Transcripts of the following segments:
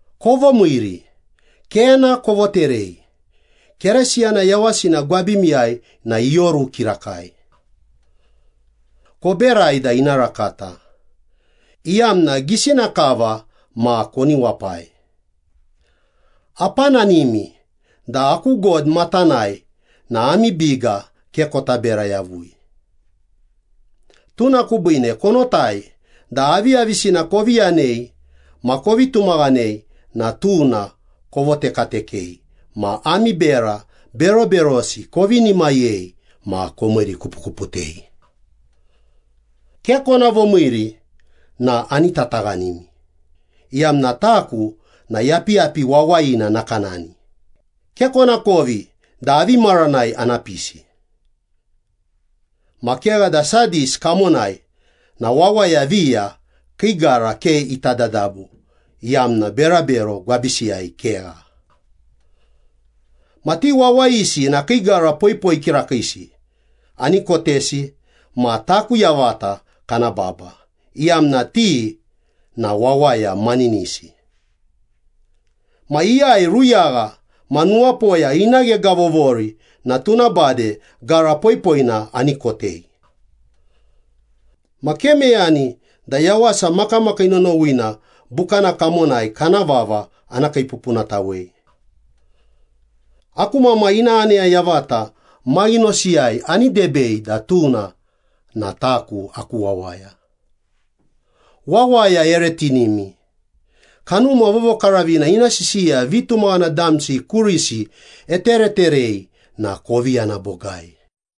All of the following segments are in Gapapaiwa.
Kovomiiri. Kena kovoterei. Keresiyana yawasina gwabimiyai na ioru kirakai. Koberai da ina rakata, iyamna gisina kava ma koni wapai. Apananimi da aku God matanai na ami biga ke kota bera yavui. Tuna kubiine konotai da aviyavisina kovi yanei ma kovi tumaghanei na tuna kovotekatekei ma ami bera beroberosi kovinimayei ma komiirikupukuputei. Ke kona vomiiri na ani tataghanimi, iyamna taku na yapiyapi wawayina nakanani, ke konakovi da avi maranai ana pisi. Ma kegha da Sadis kamonai na wawaya viya kii gara ke iti dadabu iyamna berabero gwabisiyai kegha. Ma ti wawayisi na kii gara poipoi kirakiisi ani kotesi ma taku yavata kana baba, iyamna ti na wawaya maninisi. Ma iyai ruyagha ma nuwapoya ina ghegavovori na tuna bade gara poipoina ani kotei. Ma ke meyani da Yawasa Makamakii Nonowina Bukana kamonai kana vava ana kiipupunatawei. Aku Mamai ina aneya yavata maghinosiyai ani debei da tuna na taku aku wawaya.’ ‘Wawaya ere tinimi, Kanuma Vovokaravina ina sisiya vitumaghana damsi kurisi etereterei na kovi yana bogai.’”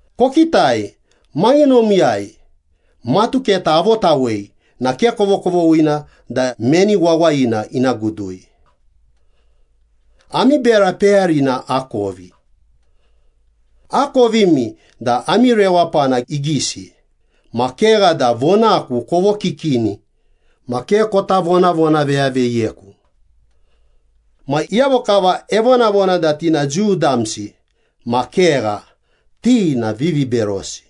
‘Kokitai, maghinomiyai matuketa avotawei na ke kovokovoghina da meni wawayina ina gudui. Ami bera peyarina akovi. Akovimi da ami rewapana igisi, ma kegha da vonaku kovokikini ma ke kota vonavonaveyaveyiyeku. Ma iyavo kava evonavona da ti na Jiu damsi ma kegha, ti na viviberosi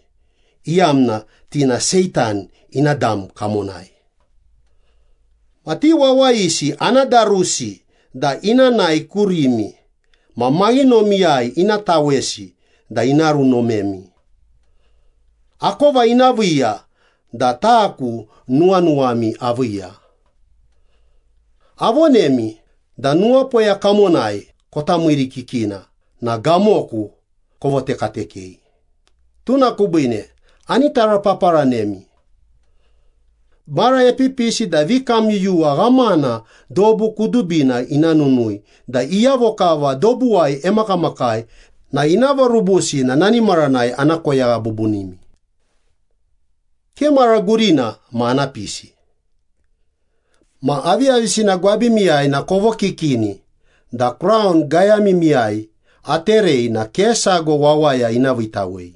iyamna ti na Seitan ina dam kamonai. Ma ti wawayisi ana darusi da ina nae kurimi ma maghinomiyai ina tawesi da ina runomemi. Akova ina viiya da taku nuwanuwami aviiya. Avonemi da nuwapoya kamonai kota miirikikina na gamoku kovotekatekei, tuna kubiine ani tarapaparanemi. Mara epipisi da vikamyuyuwa ghamana dobu kudubina ina nunui da iyavo kava dobuwai emakamakai na ina vorubusi na nani maranai ana koyagha bubunimi. Ke mara gurina ma ana pisi. Ma aviyavisina gwabimiyai na kovokikini da kraun gayamimiyai aterei na ke sago wawaya ina viitawei.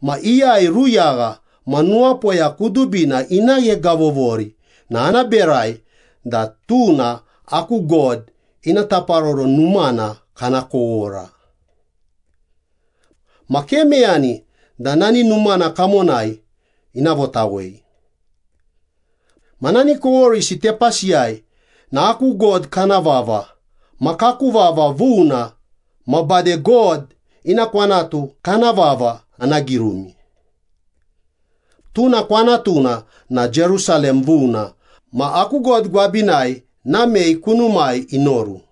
Ma iyai ruyagha ma nuwapoya kudubina ina ghegavovori na ana berai da tuna aku God ina taparoro numana kana kowora. Ma ke meyani da nani numana kamonai ina votawei. Ma nani koworisi tepasiyai na aku God kana vava ma kaku vava vuna ma bade God ina kwanatu kana vava ana girumi. Tuna kwanatuna na Jerusalem vuna ma aku God gwabinai namei kunumai inoru.’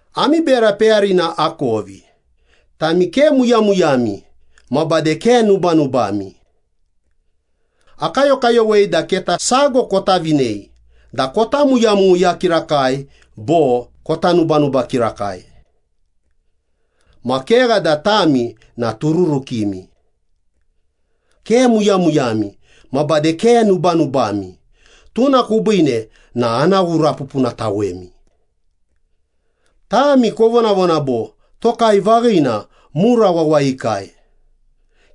‘Ami bera peyarina akovi, tami ke muyamuyami ma bade ke nubanubami. Akayokayowei da keta sago kota vinei da kota muyamuya kirakai bo kota nubanuba kirakai. Ma kegha da tami na tururukimi. Ke muyamuyami ma bade ke nubanubami, tuna kubiine na ana ghurapupunatawemi. Tami kovonavona bo, “Tokai vaghina, mura wawayikai,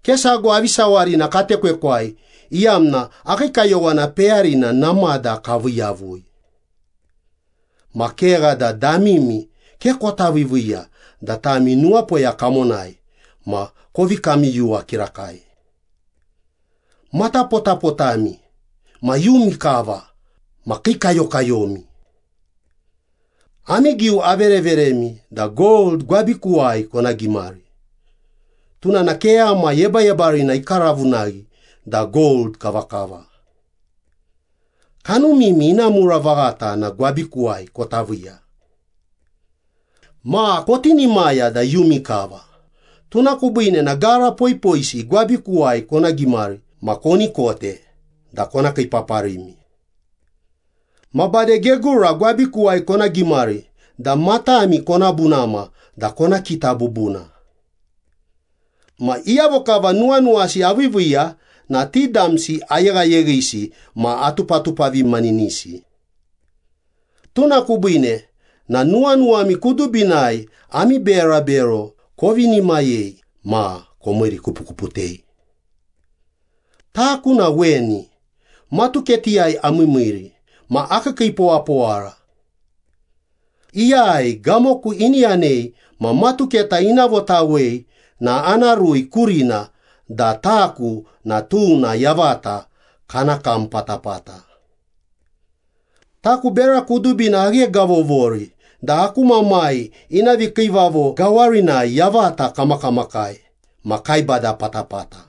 ke sago avi sawarina katekwekwai iyamna akii kayowana peyarina namada kavii yavui.” Ma kegha da damimi ke kota viiviiya da tami nuwapoya kamonai ma kovi kamyuyuwa kirakai. Matapotapotami ma iyumi kava ma kiikayokayomi. Ami giu avereveremi da gold gwabikuwai kona gimari, tuna na keyama yebayebarina ikaravunaghi da gold kavakava. Kanumimi ina mura vaghata na gwabikuwai kota viiya. Ma kotinimaya da iyumi kava, tuna kubiine na gara poipoisi gwabikuwai kona gimari ma koni kote da kona kiipaparimi. Ma bade gegura gwabikuwai kona gimari da matami kona bunama da kona kita bubuna. Ma iyavo kava nuwanuwasi aviiviiya na ti damsi ayeghayeghisi ma atupatupavimaninisi. Tuna kubiine na nuwanuwami kudubinai ami berabero kovinimayei ma komiirikupukuputei. Taku na weni, matuketiyai amiimiiri ma akiikiipowapowara. Iyai gamoku ini yanei ma matuketa ina votawei na ana rui kurina da taku na tuna yavata kana kam patapata. Taku bera kudubina aghegavovori da aku Mamai ina vikiivavo gawarinai yavata kamakamakai ma kaibada patapata.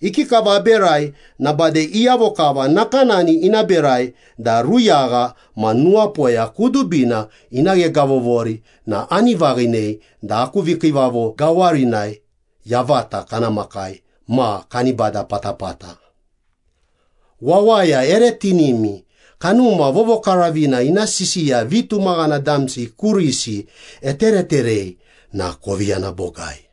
Ikikava aberai na bade iyavo kava nakanani ina berai da ruyagha ma nuwapoya kudubina ina ghegavovori na ani vaghinei da aku vikiivavo gawarinai yavata kana makai ma kani bada patapata.’ ‘Wawaya ere tinimi, Kanuma Vovokaravina ina sisiya vitumaghana damsi kurisi etereterei na kovi yana bogai.’”